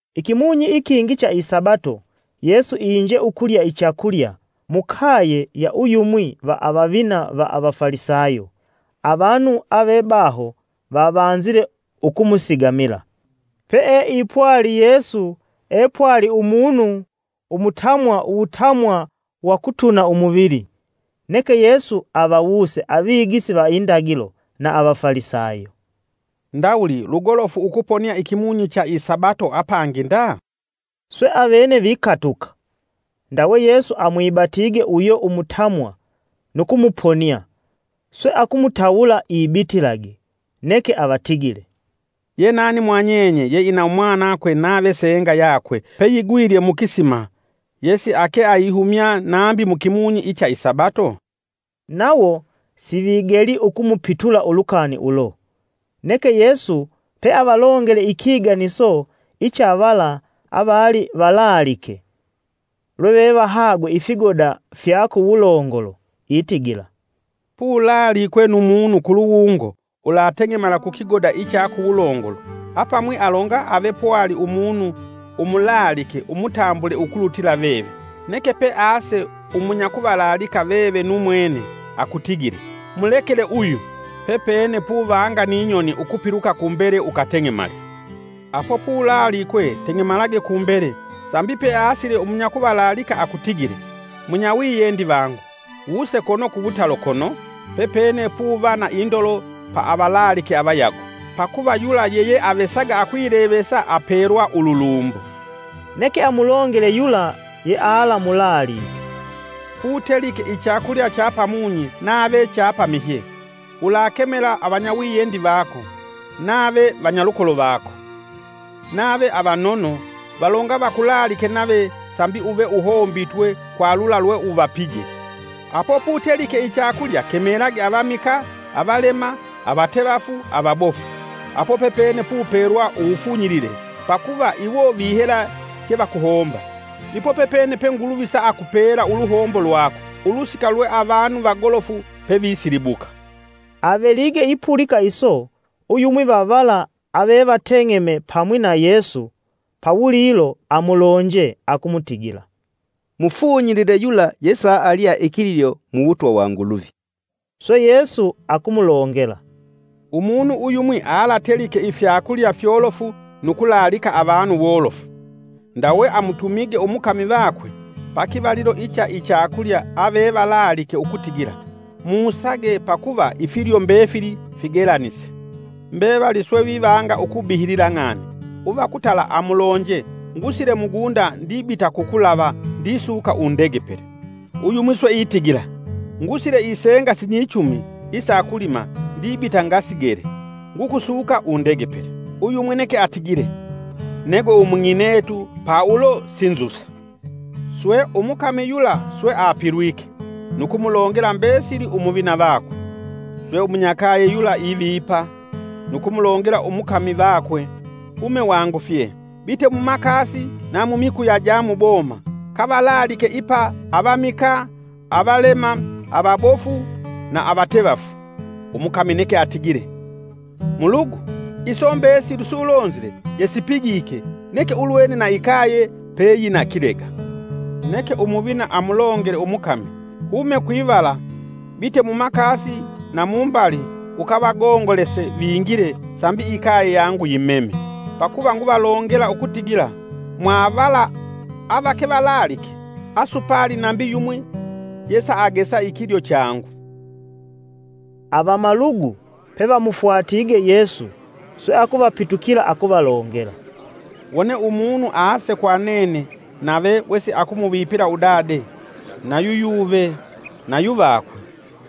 Ikimunyi ikingi cha isabato, Yesu inje ukulya ichakulya, mukaye ya uyumwi va avavina va avafalisayo, avanu avebaho vavanzile ukumusigamila. Peeipwali Yesu epwali umunu umutamwa uwutamwa wa kutuna umuvili. Neke Yesu avawuse avigisi va indagilo na avafalisayo, “Ndawuli lugolofu ukuponia ikimunyi cha isabato apangi nda?” Swe avene vikatuka. Ndawe Yesu amwibatige uyo umutamwa nu kumuponia swe akumutawula ibitilage. Neke avatigile, “Ye nani mwa nyenye yeina umwanakwe nave senga yakwe peyigwilye mukisima yesiake aihumya nambi mukimunyi icha isabato?” Nawo sivigeli ukumupitula ulukani ulo. Neke Yesu peavalongele ikiganiso icha vala avali valaalike, lwevevahagwe ifigoda fya kuwulongolo itigila, “Pulaalikwe nu munu kuluwungo ulateng'emala ku kigoda icha kuwulongolo, apamwi alonga ave pwali umunu umulaalike umutambule ukulutila veve, Neke pease umunyakuvalaalika veve nu mwene akutigile, ‘Mulekele uyu!’ Pepene puvanga ni nyoni ukupiluka kumbele ukateng'emale. Apo pulaalikwe teng'emalage kumbele sambi peasile umunyakuvalaalika akutigile, ‘Munyawiyendi vangu, wuse kono kuwutalo kono, pepene puva na indolo pa avalaalike avayago.’ Pakuva yula yeyeavesaga akwilevesa apelwa ululumbo.” Neke amulongele yula yealamulaalike, “Putelike ichakulya cha pamunyi nave cha pamihye, ulakemela avanyawiyendi vako, nave vanyalukolo vako, nave avanono, valonga vakulaalike nave sambi uve uhombitwe kwa lula lweuvapije. Apo putelike ichakulya kemelage avamikaa, avalema, avatevafu, avabofu, apo pepene pupelwa uwufunyilile, pakuva iwo vihela chevakuhomba. Ipo pepene pe Nguluvi saakupela uluhombo lwako, ulusika lwe avanu vagolofu pevisilibuka.” Avelige ipulika iso uyumwi va vala avevateng'eme pamwi na Yesu pawulilo amulonje akumutigila, “Mufunyilile yula yesaalya ikilyo muwutwa wa Nguluvi.” Swe Yesu akumulongela, “Umunu uyumwi alatelike ifyakulya fyolofu nu kulaalika avanu wolofu. Ndawe amutumige umukami vakwe, pakivalilo icha ichakulya avevalaalike ukutigila musage pakuva ifilyo mbefili figelanise. Mbevali swe vivanga ukubihilila ng'ani: ‘Uva kutala amulonje ngusile mugunda ndibita kukulava ndisuka undegepele.’ Uyumwi swe itigila: ‘Ngusile isenga sinyichumi isa kulima ndibita ngasigele; ngukusuka undegepele.’ Uyumwi neke atigile: ‘Negwe umung'inetu pa ulo sinzusa.’ Swe umukami yula swe apilwike, nu kumulongela mbesili umuvina vakwe. Swe umunyakaye yula ivipa, nu kumulongela umukami vakwe: ‘Hume wangufye bite mumakasi na mumikuya ja muboma, kavalaalike ipa avamikaa, avalema, avabofu na avatevafu.’ Umukami neke atigile: ‘Mulugu, iso mbesili sulonzile yesipigike, neke ulwene na ikaye peyina kilega.’ Neke Umuvina amulongele umukami, ‘Hume kwivala bite mumakasi na mumbali, ukavagongolese vingile sambi ikaye yangu yimeme. Pakuva nguvalongela ukutigila mwavala avake valaalike, asupali nambi yumwi yesagesa ikilyo changu.’” Avamalugu pevamufwatige Yesu swe akuvapitukila akuvalongela, “Wone umunu ase kwa nene nave wesakumuvipila udade, nayu yuve, nayu vakwe,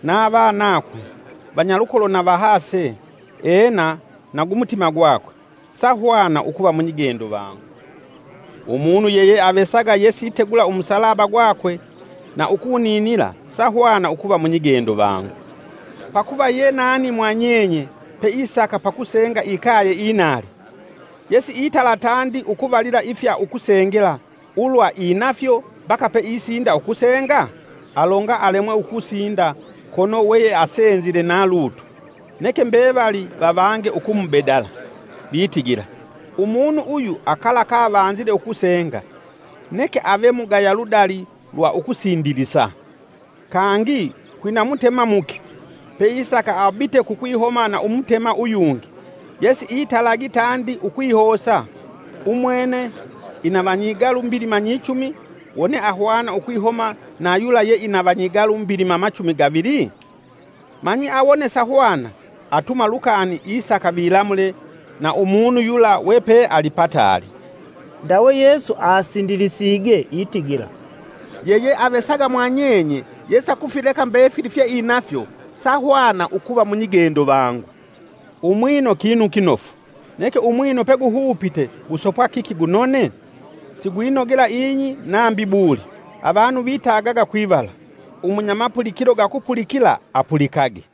na vanakwe, vanyalukolo na vahase, ena nagumutima gwakwe, sahwana ukuva munyigendo vangu. Umunu yeyeavesaga yesitegula umusalaba gwakwe na ukuninila sahwana ukuva munyigendo vangu. Pakuva ye nani mwa nyenye peisaka pakusenga ikaye inali, yesiaitala tandi ukuvalila ifya ukusengela ulwa inafyo mbaka peisinda ukusenga? Alonga alemwe ukusinda kono we yeasenzile na lutu, neke mbevali vavange ukumubedala vitigila: ‘Umunu uyu akala kavanzile ukusenga, neke ave mugaya ludali lwa ukusindilisa.’ “Kangi kwina mutema muki, peisaka abite kukwihoma na umutema uyungi, yesiitalagi tandi ukwihosa. Umwene ina vanyigalu mbilima nyichumi wone ahwana ukwihoma na yula yeina vanyigalu mbilima machumi gavili? Manyi awone sahwana, atuma lukani isaka vilamule na umunu yula wepe ali pataali.” Ndawe Yesu asindilisige itigila, “Yeyeavesaga mwanyenye, yesakufileka mbefili fyeinafyo, sahwana ukuva munyigendo vangu.” “Umwino kinu kinofu, neke umwino peguhupite gusopwa kiki gunone? Sigwinogela ing'i nambi buli, avanu vitagaga kwivala. Umunyamapulikilo gakupulikila apulikage!”